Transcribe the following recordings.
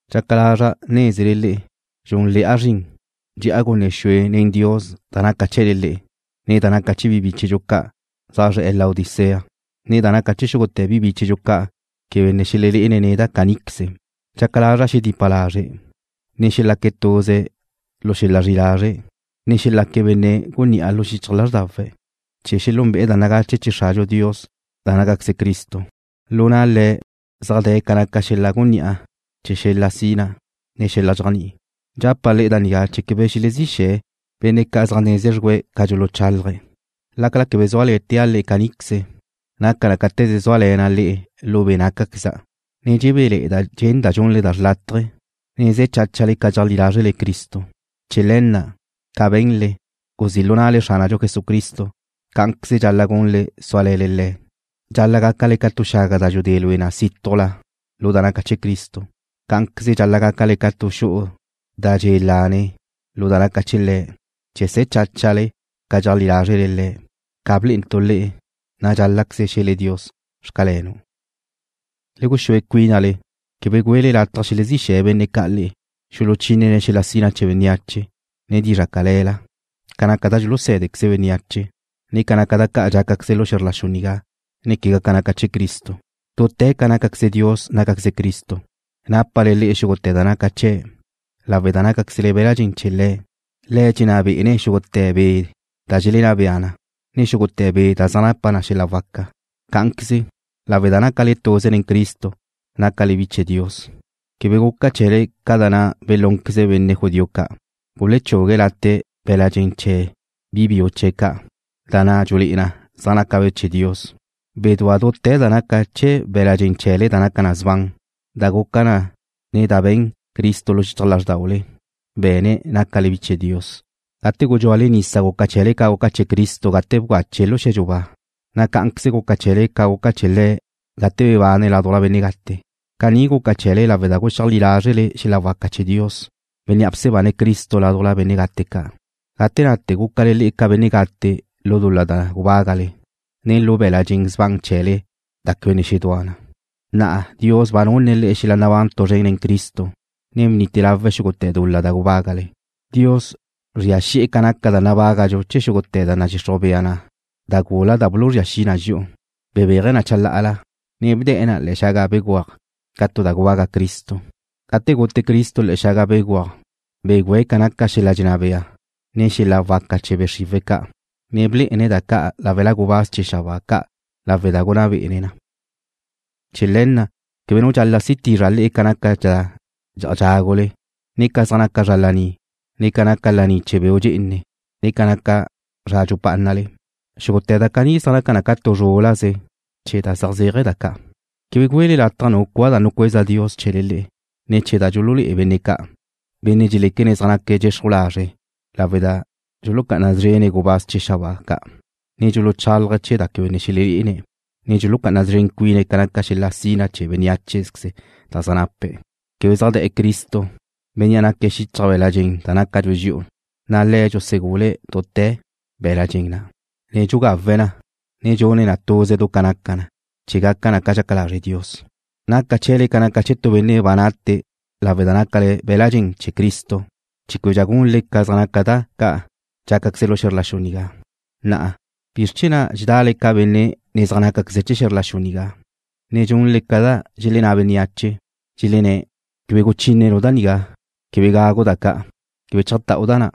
Dxaca lazra' nézele le'e dxúnle̱'a zrin, dxe'a gunne xue le̱n Dios da naca chee̱le le'e, ne da naca chee̱ bi bíchedxu ca' ca' zaj zre̱'e̱ Laodicea, ne da naca chee̱ xúgute̱ bi bíchedxu ca' quebe ne xelelé'ene̱' neda' caníqueze. Dxaca lazra' xeledipa lazre̱', ne xelaque̱' tuze lu xel-la zri'i lazre', ne xelaque̱' benne' gunní'a lu xichaj lázrdawe̱', chee̱ xelúnbe'e̱ da nagache chee̱ Xradxu Dios da nácaqueze Cristo. Lu na' Le̱' zaj de̱ ca naca xel-la gunní'a chee̱ xel-la sina, ne xel-la dxéajni'i. Dxapa' le'e da nigá chee̱ quebe xelezí xe̱ le'e benne' ca' zaj neze xrgúe̱' ca dxuluchálaje̱'. Lácala quebe zúale̱tea' le'e caníqueze, naca na cáte̱ze zúale̱na' le'e lu be' nácaqueza', na' dxebéle̱'e̱da' dxenda' dxunle da xlátaje̱, ne ze̱ cháchale ca dxeajlí lázrele Cristo. Chee̱ le̱ na', ca be̱nle, guzí' lu na'le Xránadxu Jesucristo, cá'anqueze dxal-la' gunle súale̱le Le̱'. Dxal-la' gácale ca tu xaga da dxudé lue na sítujla lu da naca chee̱ Cristo. Cá'anqueze dxal-la' gácale ca tu xu'u da dxe' lane lu da naca chee̱' Le̱', chee̱ se̱ cháchale ca dxeajlí lázrele Le̱', ca blé'entu' le'e, na' dxál-la'queze xe̱le Dios: Xcalenu'. Le guxúe cuínale. Quebe güele lataj xelezí xe̱ benne' ca' le'e, xuluchínene̱' xel-la sina chee̱ bénneache, ne dizra' cale̱la, ca naca da dxulusé̱dequeze bénneache, ne ca zaj naca da ca' dxácaqueze lu xe̱zr la xu nigá, ne quegá ca naca chee̱ Cristo. Dute̱ ca naca Dios nácaqueze Cristo. Nápale le'e xúgute̱ da naca chee̱' lawe' da nácaquezle be̱l-la' dxen chee̱ Le̱'. Le̱' dxenná be'ene̱' xúgute̱ be' da dxelenná bea na, ne xúgute̱ be' da zaj napa na xel-la waca. Cá'anqueze, lawe' da nácale tuze nen Cristo nácale bi chee̱ Dios. Quebe guca chee̱le ca da na' belúnqueze benne' judío ca', gulechugue̱' late' be̱l-la' dxen chee̱ bi biu chee̱' ca', da na' dxulé'e na zaj nácabe' chee̱ Dios. Bedúa dute̱ da naca chee̱ be̱la' dxen chee̱le da naca sban, da guca na ne̱ chee̱ da be̱n Cristo lu xichaj lázrdaule. Be̱ne̱' nácale bi chee̱ Dios. Gate gudxúale nisa guca chee̱le ca guca chee̱ Cristo gate bgache̱' lu xe̱dxu ba, na' cá'anqueze guca chee̱le ca guca chee̱ Le̱' gate bebane̱' ládujla benne' gate. Caní guca chee̱le lawe' da guxeajlí lázrele xel-la waca chee̱ Dios, Bénnea' bsebane̱' Cristo ládujla benne' gate ca'. Gate nate gúcale le'e ca benne' gate lu dul-la da gubágale, ne lu be̱la' dxen sban chee̱le da quebe ne xedúa na. Na'a Dios ba nunne̱' le'e xel-la nabán tu zren nen Cristo, ne ba bnite lawe̱' xúgute̱ dul-la da gubágale. Dios bzria xi'e̱ ca naca da nabágadxu chee̱ xúgute̱ da nadxixruj bea na da gula da buluzría xi na dxi'u. Bebéaje̱' na chalá'ala, ne bde̱'e̱ na le̱'e̱ xaga béguaj ca tu da gubaga' Cristo. Gate gute Cristo le̱'e̱ xaga béguaj begüe̱' ca naca xel-la dxenná bea, ne xel-la waca chee̱ be' xriwe̱' ca', na' blé'ene̱' da ca' láwela gubáz chee̱ xabáa ca' lawe' da gunná bé'ene̱' na. Chee̱ le̱ na', quebe nu dxal-la' si tizra' le'e ca naca da dxe'aj da dxágule, ne ca zaj naca zra laní, ne ca naca laní chee̱ beu' dxe'ene, ne ca zaj naca zra dxupá'anale. Xúgute̱ da caní zaj naca na ca tu zrúl-laze chee̱ da zaj zéaje̱ da ca'. Quebe güele lataj nu cua da nucueza Dios chee̱le le'e, ne̱ chee̱ da dxululé'e benne' ca', benne' dxeléquene̱' zaj naque̱' dxexruj lazre' lawe' da dxulucá'ana szrene̱' gubáz chee̱ xabáa ca', ne dxuluchálaje̱' chee̱ da quebe ne xelelé'ene̱', ne dxulucá'ana szren cuine̱' ca naca xel-la sina chee̱ bénneacheze da zaj nape̱'. Quebe zaj de̱'e̱ Cristo, Bénnea' naque̱' xichaj be̱l-la' dxen da nácadxu dxi'u, na' Le̱' dxusegule̱' dute̱ be̱l-la' dxen na', ne dxugawe̱' na, ne dxune̱' na tuze du ca naca na, chee̱ gaca na ca dxaca lazre' Dios. Naca chee̱le ca naca chee̱ tu benne' ba nate lawe' da nácale be̱l-la' dxen chee̱ Cristo, chee̱ québedxa gunle ca zaj naca da ca' dxácaqueze lu xe̱zr la xu nigá. Na'a, ¿bizr chee̱ na' dxedale ca benne' ne zaj nácaqueze̱' chee̱ xe̱zr la xu nigá, ne dxunle ca da dxelenná bea bénneache. Dxelenné̱': Quebe guchínenu' da nigá. Quebe gagu' da ca'. Quebe chajtáu' da na'.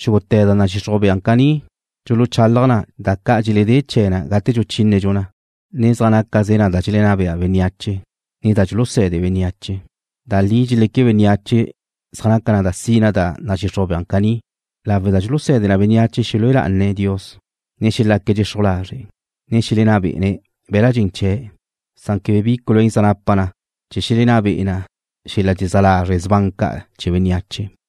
Xúgute̱ da nadxixruj bea caní dxuluchalaj na chee̱ da ca' dxeledé chee̱ na gate dxuchínedxu na, ne zaj nácaze na da dxelenná bea bénneache, ne da dxuluse̱de bénneache. Da li dxeleque bénneache zaj naca na sina da nadxixruj bea caní, lawe' da dxuluse̱de na bénneache xelúe lá'ane̱' Dios, ne xelaque̱' dxexruj lazre', ne xelenná be'ene̱' be̱l-la' dxen chee̱'. Quebe bi culuén zaj napa na chee̱ xelenná be'e na xel-la dxezá lazre' sban ca' chee̱ bénneache.